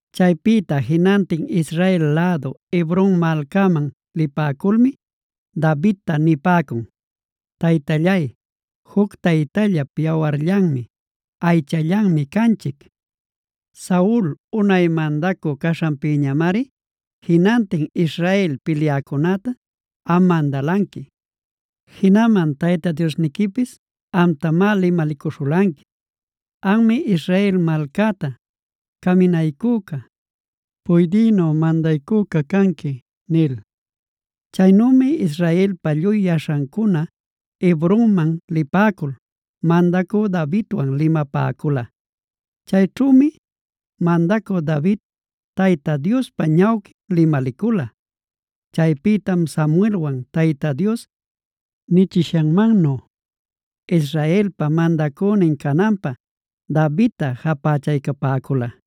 Chaypïta jinantin Israel lädu Hebron malcaman lipäculmi Davidta nipäcun: “Taytallay, juc taytallap yawarllanmi, aychallanmi canchic. Saul unay mandacü caśhanpïñamari jinantin Israel pilyäcunäta am mandalanqui. Jinaman Tayta Diosniquipis amtamá limalicuśhulanqui: ‘Anmi Israel malcäta caminaycüca, puydïnu mandaycüca canqui’” nil. Chaynümi Israelpa lluy yaśhancuna Hebronman lipäcul mandacü Davidwan limapäcula. Chayćhümi mandacü David Tayta Diospa ñawquin limalicula. Chaypïtam Samuelwan Tayta Dios nichishanmannu Israelpa mandacünin cananpä Davidta japächaycapäcula.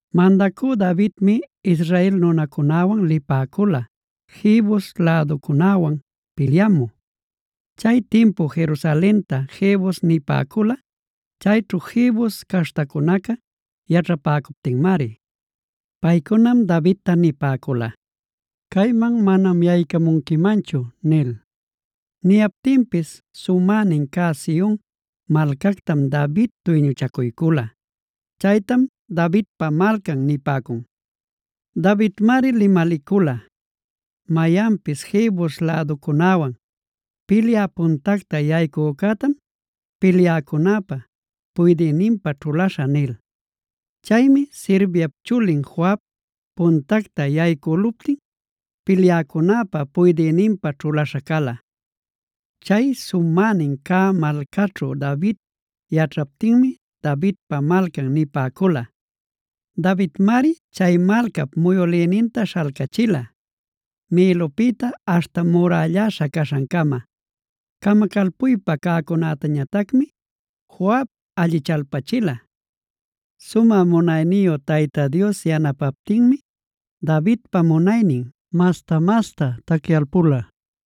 Mandacü Davidmi Israel nunancunawan lipäcula Jebus läducunäwan pilyamü. Chay timpu Jerusalenta Jebus nipäcula, chayćhu Jebus caśhtacunaca yaćhapäcuptinmari. Paycunam Davidta nipäcula: “Cayman manam yaycamunquimanchu” nil. Niyaptinpis sumänin cä Sion malcactam David duyñuchacuycula. Chaytam Davidpa Malcan nipäcun. Davidmari limalicula: “Mayanpis Jebus läducunäwan pilyä puntacta yaycücätam, pilyäcunäpa puydïninpä ćhulaśhä” nil. Chaymi Sarviap chulin Joab puntacta yaycüluptin pilyäcunäpa puydïninpä ćhulaśha cala. Chay sumänin cä malcaćhu David yaćhaptinmi Davidpa Malcan nipäcula. Davidmari chay malcap muyülïninta śhalcachila, Milopïtaa aśhta murälläśha caśhancama. Camacalpuypa cäcunätañatacmi Joab allichalpachila. Sumä munayniyu Tayta Dios yanapaptinmi Davidpa munaynin masta-masta tacyalpula.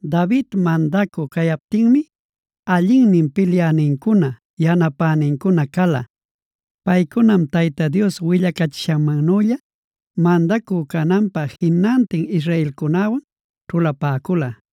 David mandacü cayaptinmi allinnin pilyänincuna, yanapänincuna cala. Paycunam Tayta Dios willacachishannülla mandacü cananpä jinantin israelcunäwan ćhulapäcula.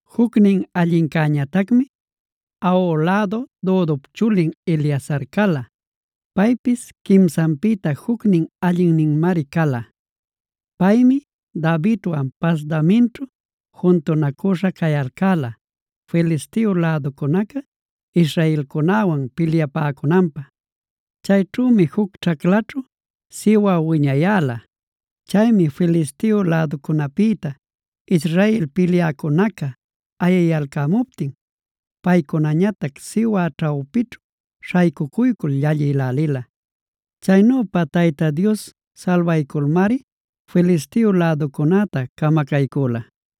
Jucnin allincäñatacmi Ahoh lädu Dodop chulin Eleazar cala. Paypis quimsanpïta jucnin allinninmari cala. Paymi Davidwan Pasdamimćhu juntunacüśha cayalcäla Filisteo läducunaca israelcunäwan pilyapäcunanpä. Chayćhümi juc ćhaclaćhu siwä wiñayäla. Chaymi Filisteo läducunäpïta Israel pilyäcunaca ayiyalcämuptin, paycunañatac siwä ćhawpićhu śhaycucuycul llallïlälila. Chaynüpa Tayta Dios salbayculmari Filisteo läducunäta camacaycüla.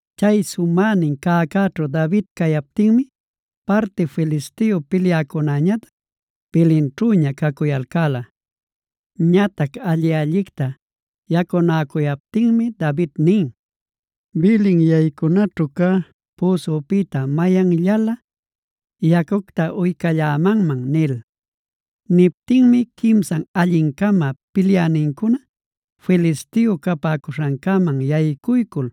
Chay sumänin cäcäćhu David cayaptinmi parti Filisteo pilyäcunäñatac Belenćhüña cacuyalcäla. Ñatac alli-allicta yacunäcuyaptinmi David nin: “¡Belen yaycunaćhu cä püsupïta mayanllalä yacucta uycallämanman!” nil. Niptinmi quimsan alli-cama pilyänincuna Filisteo capäcuśhancäman yaycuycul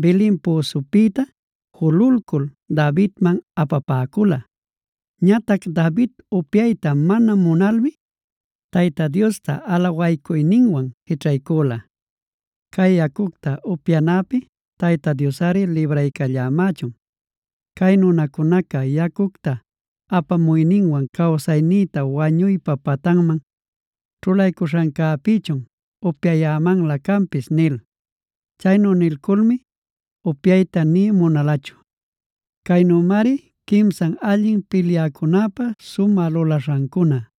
Belen püsupïta jululcul Davidman apapäcula. Ñatac David upyayta mana munalmi Tayta Diosta alawaycuyninwan jićhaycula: “¡Cay yacucta upyanäpi Tayta Diosꞌari libraycallämächun! Cay nunacunaca yacucta apamuyninwan cawsayninta wañuypa patanman ćhulaycuśhancäpïchun upyayämanlä canpis” nil. Chaynu nilculmi upyayta nï munalachu. Caynümari quimsan allin pilyäcunäpa sumä lulaśhancuna.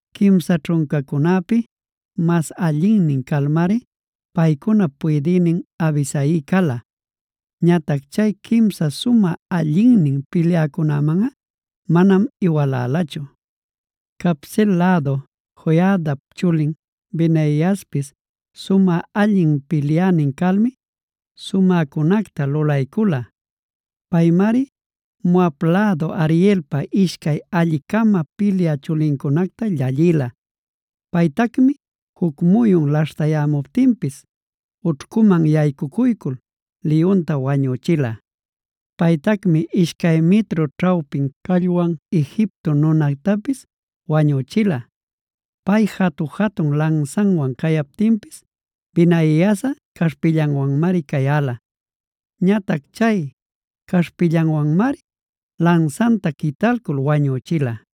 Quimsa ćhuncacunäpi mas allinnin calmari paycunap puydïnin Abisai cala. Ñatac chay quimsa sumä allinnin pilyäcunämanꞌa manam iwalalachu. Cabseel lädu Joiadap chulin Benaiaspis sumä allin pilyänin calmi sumäcunacta lulaycula. Paymari Moab lädu Arielpa ishcay alli-cama pilyä chulincunacta llallïla. Paytacmi juc muyun laśhtayämuptinpis ućhcuman yaycuycul liyunta wañüchila. Paytacmi ishcay mitru ćhawpin callwan Egipto nunactapis wañüchila. Pay jatu-jatun lansanwan cayaptinpis Benaiasꞌa caśhpillanwanmari cayäla. Ñatac chay caśhpillanwanmari lansanta quitalcul wañüchila.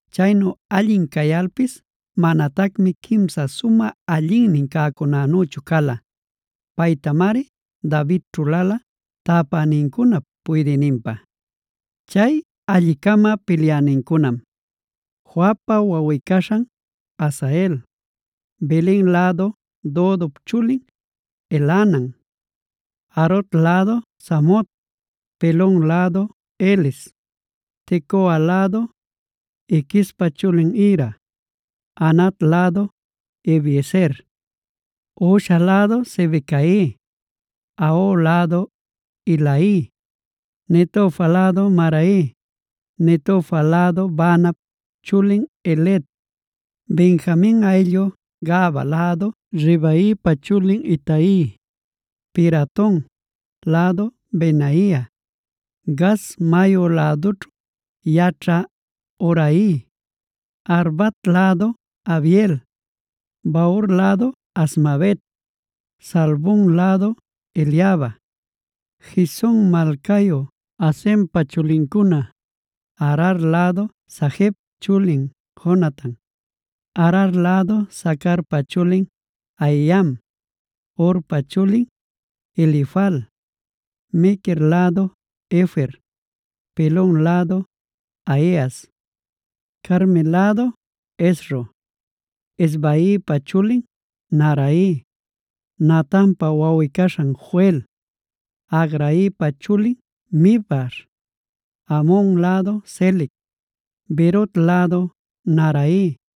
Chaynu allin cayalpis manatacmi quimsa sumä allinnin cäcunänüchu cala. Paytamari David ćhulala tapänincunap puydïninpä. Chay alli-cama pilyanincunam: Joabpa wawꞌi-caśhan Asael, Belen lädu Dodop chulin Elhanan, Harod lädu Samot, Pelon lädu Heles, Tecoa lädu Iquespa chulin Ira, Anat lädu Abiezer, Husha lädu Sibecai, Ahoh lädu Ilai, Netofa lädu Maharai, Netofa lädu Baanap chulin Heled, Benjamin ayllu Gabaa lädu Ribaipa chulin Itai, Piraton lädu Benaia, Gaas mayu lädućhu yaćhä Hurai, Arbat lädu Abiel, Bahur lädu Azmavet Saalbon lädu Eliaba, Gizon malcayu Hasempa chulincuna, Arar lädu Sagep chulin Jonatan, Arar lädu Sacarpa chulin Ahiam, Urpa chulin Elifal, Mequer lädu Hefer, Pelon lädu Ahias, Carmel lädu Hezro, Ezbaipa chulin Naarai, Natanpa wawꞌi-caśhan Joel, Hagraipa chulin Mibhar, Amon lädu Selec, Beerot lädu Naharai.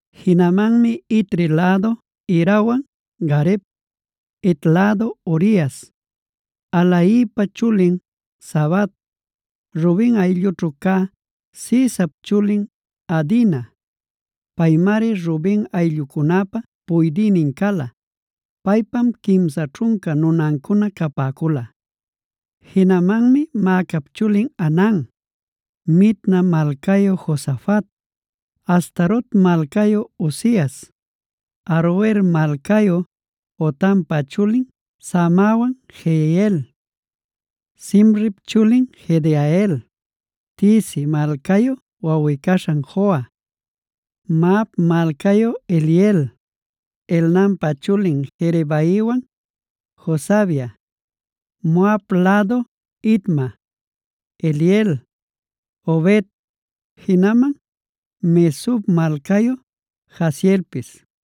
Jinamanmi Itri lädu Irawan Gareb, Het lädu Urias, Ahlaipa chulin Zabad, Ruben ayllućhu cä Sizap chulin Adina. (Paymari Ruben ayllucunäpa puydïnin cala. Paypam quimsa ćhunca nunancuna capäcula.) Jinamanmi Maacap chulin Hanan, Mitna malcayu Josafat, Astarot malcayu Uzias, Aroer malcayu Hotampa chulin Samawan Jehiel, Simrip chulin Jediael, Tizi malcayu wawꞌi-caśhan Joha, Mahav malcayu Eliel, Elnaampa chulin Jerebaiwan Josavia, Moab lädu Itma, Eliel, Obed, jinaman Mesob malcayu Jaasielpis.